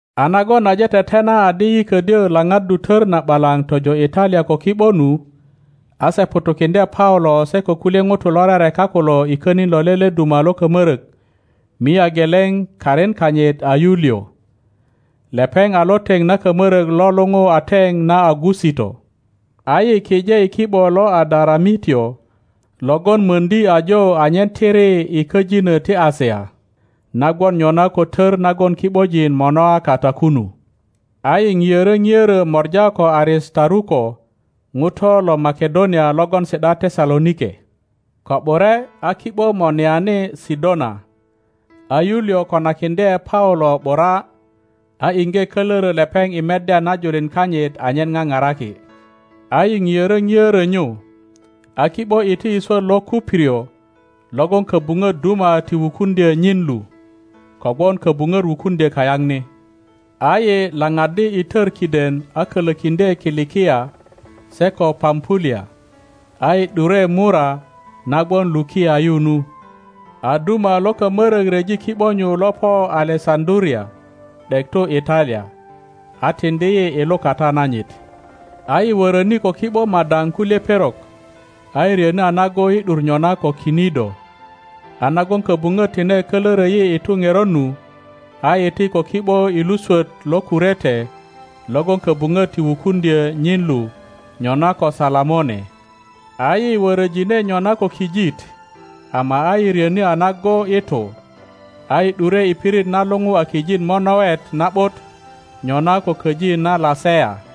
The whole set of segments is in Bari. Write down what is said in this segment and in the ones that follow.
A nagon aje tetena adi yi ködyö laŋaddu tör na ’balaŋ tojo Italia ko ki ’bo nu, a se ŋutukiŋdye Paulo se ko kulye ŋutu lo rereka kulo i könin lo lele duma lo kamörök mia geleŋ karin kanyit a Yuliŋ. Lepeŋ a lo teŋ na kamörök lo luŋu a Teŋ na Augusito. A yi kije i ki ’bo lo Adaramitio logon möŋdi ajo anyen tiri i köjinö ti Asia na gwon nyona ko tör nagon ki ’bojin monoa kata kunu. A yi ŋiörö ŋiörö mora ko Aristaruko ŋuto lo Makedonia logon si ’da Tesalonike. Ko ’bure a ki ’bo monoani Sidona, a Yuliŋ konakiŋdye Paulo ’bura, a iŋge kölörö lepeŋ i meddya na julin kanyit anyen paparaki. a yi ŋiörö ŋiörö nyu, a ki ’bo iti i swöt lo Kuprio logon köbuŋöt duma ti wukuŋdyö nyin lu, kogwon köbuŋöt wukuŋdyö kayaŋ ni. A yi laŋaddi i tör kiden a kölökiŋdye Kilikia se ko Pampulia, a yi ’dure Mura na gwon Lukia yu nu. A duma lo kamörök ryeji ki ’bo nyu lo po Alesaŋduria ’dek tu Italia, a tiŋdi yi i lukata nanyit. a yi wöröni ko ki ’bo madaŋ kulye perok, a yi ryöni a nago i ’dur nyona ko Kinido, a nagon köbupöt tine kölörö yi i tu ŋerot nu, a yi iti ko ki ’bo i lu swöt lo Kurete logon köbuŋöt ti wukuŋdyö nyin lu nyona ko Salamone. A yi wöröjine nyona ko kijit, ama a yi ryöni a nago i tu, a yi ’dure i pirit na luŋu a Kijit monowet na ’but, nyona ko köji na Lasea.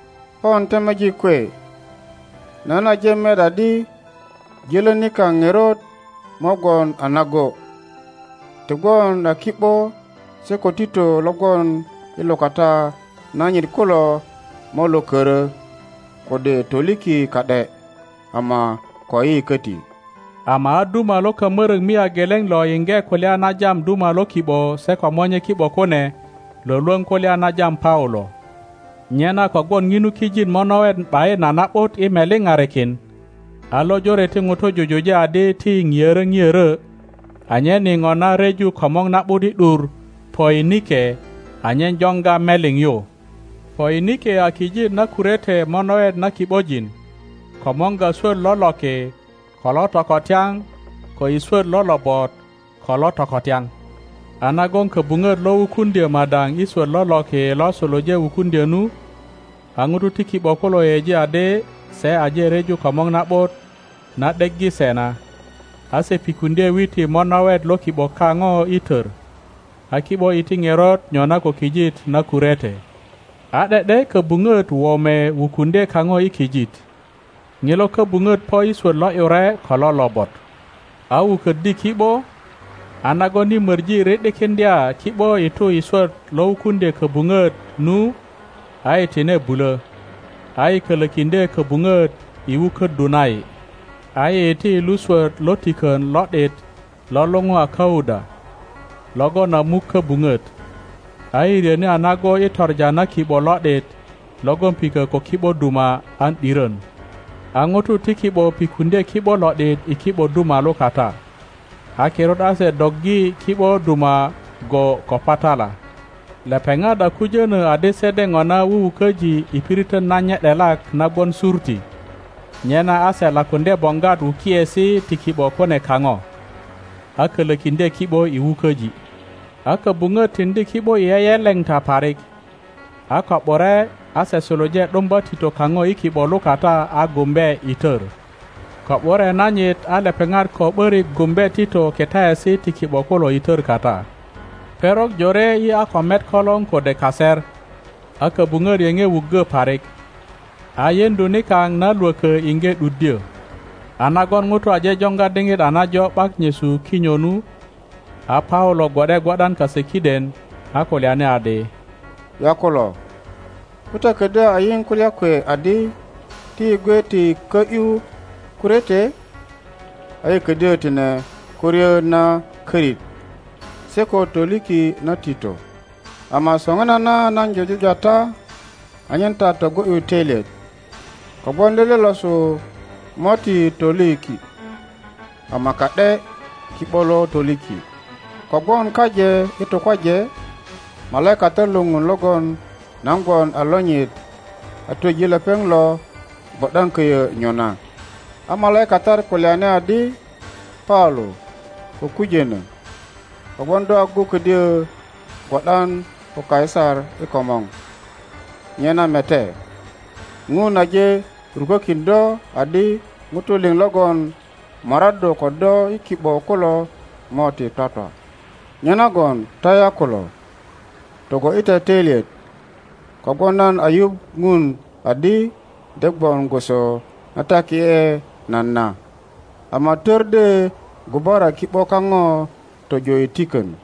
Pon temejik kwe, nan aje met adi jölö nikaŋ ŋerot mo gwon a nago; ti gwon a ki ’bo se ko tito lo gwon i lukata nanyit kulo mo lo körö kode toliki ka ’de ama koyi köti. Ama a duma lo kamörök mia geleŋ lo yiŋge kulya na jam duma lo ki ’bo se ko monye ki ’bo kune lwölwöŋ kulya na jam Paulo. Nyena kogwon ŋinu kijit monowet ’bayin a na ’but i meliparikin, a lojore ti ŋutu jujuje adi ti yi ŋiörö ŋiörö anyen yi ŋona ryeju komor na ’but i ’dur Poinike anyen joŋga meliŋ yu. (Poinike a kijit na Kurete monowet na ki ’bojin komorga swöt lo loki ko lo tokotyaŋ ko i swöt lo lobot ko lo tokotyaŋ.) A nagon köbuŋöt lo wukuŋdyö madaŋ i swöt lo loki lo suluje wukuŋdyö nu, a ŋutu ti ki ’bo kulo yeyeji adi se aje ryeju komor na ’but na ’deggi se na, a se pikuŋdye witi monowet lo ki ’bo kaŋo i tör, a ki ’bo iti ŋerot nyona ko kijit na Kurete. A ’de ’de köbuŋöt wome wukuŋdye kaŋo i kijit. Ŋilo köbuŋöt po i swöt lo ’yure ko lo lobot, a wuköddi ki ’bo, a nagon yi möŋi ri ’dikiŋdya ki ’bo i tu i swöt lo wukuŋdye köbuŋöt nu a yi tine bulö, a yi kölökiŋdye köbuŋöt i wuköddu na yi. A yi iti i lu swöt lo tikön lo ’dit lo luŋu a Kauda, logon a muk köbuŋöt, a yi ryöni a nago i toŋa na ki ’bo lo ’dit logon pikö ko ki ’bo duma an ’dirön. A ŋutu ti ki ’bo pikuŋdye ki ’bo lo ’dit i ki ’bo duma lukata. A kirut a se doggi ki ’bo duma go ko patala. Lepeŋat a kujönö adi se de ŋona wuwuköji i piritön nanye ’delak na gwon Surti, Surtinyona ko kijitna jur lo Libya nyena a se lakuŋdye boŋgwat wukiesi ti ki ’bo kune kaŋo, a kölökiŋdye ki ’bo i wuköji. A köbuŋöt tiŋdi ki ’bo i yeyeleŋta parik, a ko ’bure a se suluje ’dumba tito kaŋo i ki ’ŋo lukata a gumbe i tör. Ko ’bure nanyit a lepeŋat ko ’börik gumbe tito kitaesi ti ki ’bo kulo i tör kata. Perok jore yi a ko met kolor kode kaser, a köbuŋöt yeŋe wuggö parik, a yeŋdu nikaŋ na lwökö iŋge ’duddyö. A nagon ŋutu aje joŋga diŋit a najo ’bak nyesu kinyo nu, a Paulo gwo ’de gwo ’dan kase kiden, a kulyani adi, Yakulo, ko ta ködyö a yiŋ kulya kwe adi ti yi gwe ti kö ’yu Kurete, a yi ködyö tine ko ryö na körit se ko toliki na tito. Ama soŋinana nan jujuja ta anyen ta togo ’yu töilyet, kogwon lele losu mo ti toliki ama ka ’de ki ’bo lo toliki. Kogwon kaje i tukwaje malaikatat lo Ŋun logon nan gwon a lonyit a twöji lepeŋ lo gwo ’dan köyö nyona. A malaikatat kulyani adi, Paulo, ko kujönö, kogwon do agu ködyo gwo ’dan ko Kaisar i komor; nyena mete, Ŋun aje rukökin do adi ŋutu liŋ logon moraddu ko do i ki ’bo kulo mo ti twatwa. Nyenagon ta yakulo, togo ’yi ta töilyet, kogwon nan a yuŋ Ŋun adi de gwon gwoso na taki ’e nan na, ama tör de gubara ki ’bo kaŋo tojo i tikön.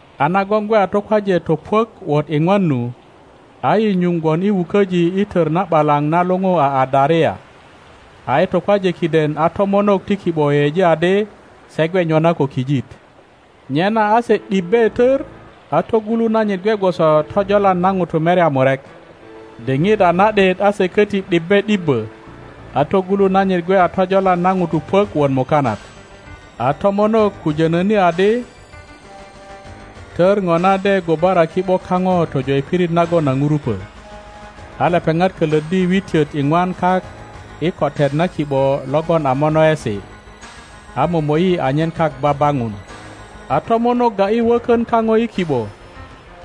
A nagon gwe a tukwaje topuök wot iŋwan nu, a yi nyuŋ gwon i wuköji i tör na ’balaŋ na luŋu a Adaria, a i tukwaje kiden a tomonok ti ki ’bo yeyeji adi se gwe nyona ko kijit. Nyena a se ’dibbe tör, a togulu nanyit gwe gwoso tojolan na ŋutu merya murek. Diŋit a na ’dit a se köti ’dibbe ’dibbö, a togulu nanyit gwe a tojolan na ŋutu puök wot mukanat. A tomonok kujönöni adi tör ŋona de gubara ki ’bo kaŋo tojo i pirit nagon a ŋurupö. A lepeŋat kölöddi witiöt iŋwan kak i kotet na ki ’bo logon a monowesi, a momo ’yi anyen kak baŋun. A tomonok ga ’yi wökön kaŋo i ki ’bo,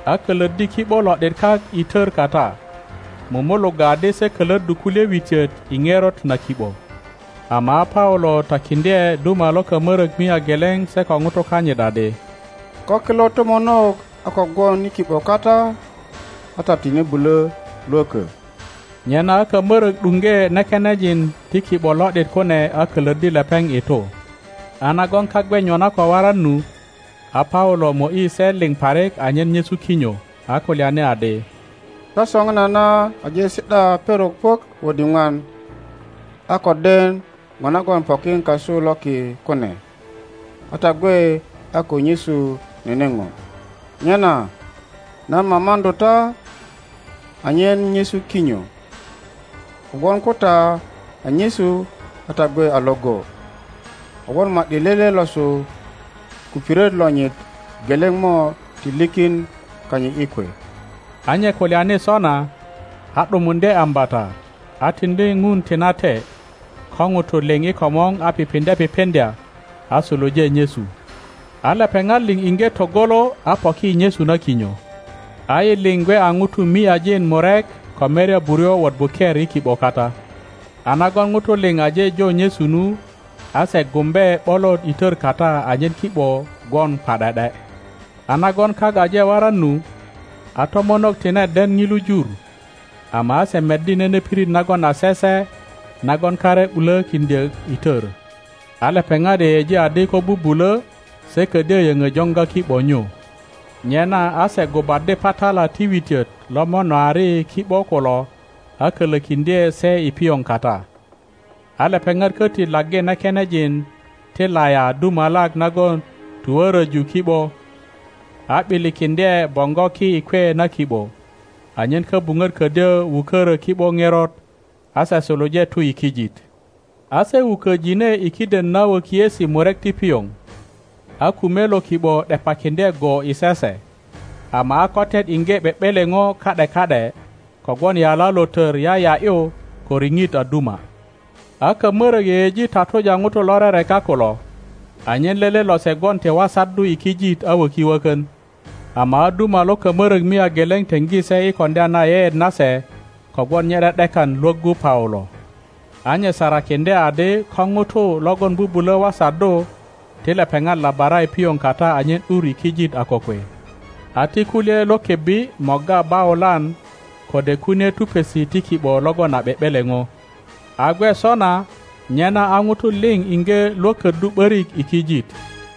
a kölöddi ki ’bo lo ’dit kak i tör kata, mumulugga adi se kölöddu kulye witiot i ŋerot na ki ’bo, ama a Paulo takiŋdye duma lo kamörök mia geleŋ se ko ŋutu kanyit adi, Ko kilo tomonok a ko gwon i ki ’bo kata a ta tine bulö lwökö. Nyena a kamörök ’duŋge nekenejin ti ki ’bo lo ’dit kune a kölöddi lepeŋ i tu. A nagon kak gwe nyona ko waran nu, a Paulo mo ’yi se liŋ parik anyen nyesu kinyo, a kulyani adi, Ta soŋinana aje si ’da perok puök wot iŋwan a ko den ŋo nagon pokin kasu loki kune, a ta gwe a ko nyesu nene ŋo. Nyena nan mamaŋdu ta anyen nyesu kinyo, kogwon ko ta a nyesu a ta gwe a iŋgo, kogwon ma ’di lele losu kupiret lonyit geleŋ mo ti likin kanyit i kwe. a nye kulyani sona, a ’dumuŋdye ambata, a tiŋdi Ŋun tinate ko ŋutu liŋ i komor a pipiŋdye pipiŋdya, a suluje nyesu. A lepeŋat liŋ iŋge togolo a poki i nyesu na kinyo. a yi liŋ gwe a ŋutu miajin murek ko merya buryo wot buker i ki ’bo kata. A nagon ŋutu liŋ aje jo nyesu nu, a se gumbe ’bolot i tör kata anyen ki ’bo gwon pa ’de ’de. A nagon kak aje waran nu, a tomonok tine den ŋilu jur, ama a se meddi nene pirit nagon a sese nagon kare ’bulökiŋdyö i tör. A lepeŋat yeyeji adi ko bubulö se ködyö yöŋö joŋga ki ’bo nyu. Nyena a se gubaddi patala ti witiöt lo monoari ki ’bo kulo a kölökiŋdye se i pioŋ kata, a lepeŋat köti laggi nekenejin ti laya dumalak nagon tuwöröju ki ’bo, a ’bilikiŋdye boŋgo ki i kwe na ki ’bo, anyen köbuŋöt ködyö wukörö ki ’bo ŋerot, a se suluje tu i kijit. A se wuköjine i kiden na wökiesi murek ti pioŋ, a kume lo ki ’bo ’depakiŋdye go i sese, ama a kotet iŋge ’be ’beleŋo ka ’de ka ’de kogwon yala lo tör yaya ’yu ko riŋit a duma. A kamörök yeyeji tatuja ŋutu lo rereka kulo, anyen lele lose gwon ti wasaddu i kijit a wöki wökön. Ama a duma lo kamörök mia geleŋ teŋgi se i koŋdya na yeyeet nase kogwon nye ’de ’dekan lwöggu Paulo. A nye sarakiŋdye adi ko ŋutu logon bubulö wasaddu ti lepeŋat labara i pioŋ kata anyen ’dur i kijit a kokwe, a ti kulye lo kebbi morga baulan kode kunie tupesi ti ki ’bo logon a ’be ’beleŋo. A gwe sona, nyena a ŋutu liŋ iŋge lwököddu ’börik i kijit.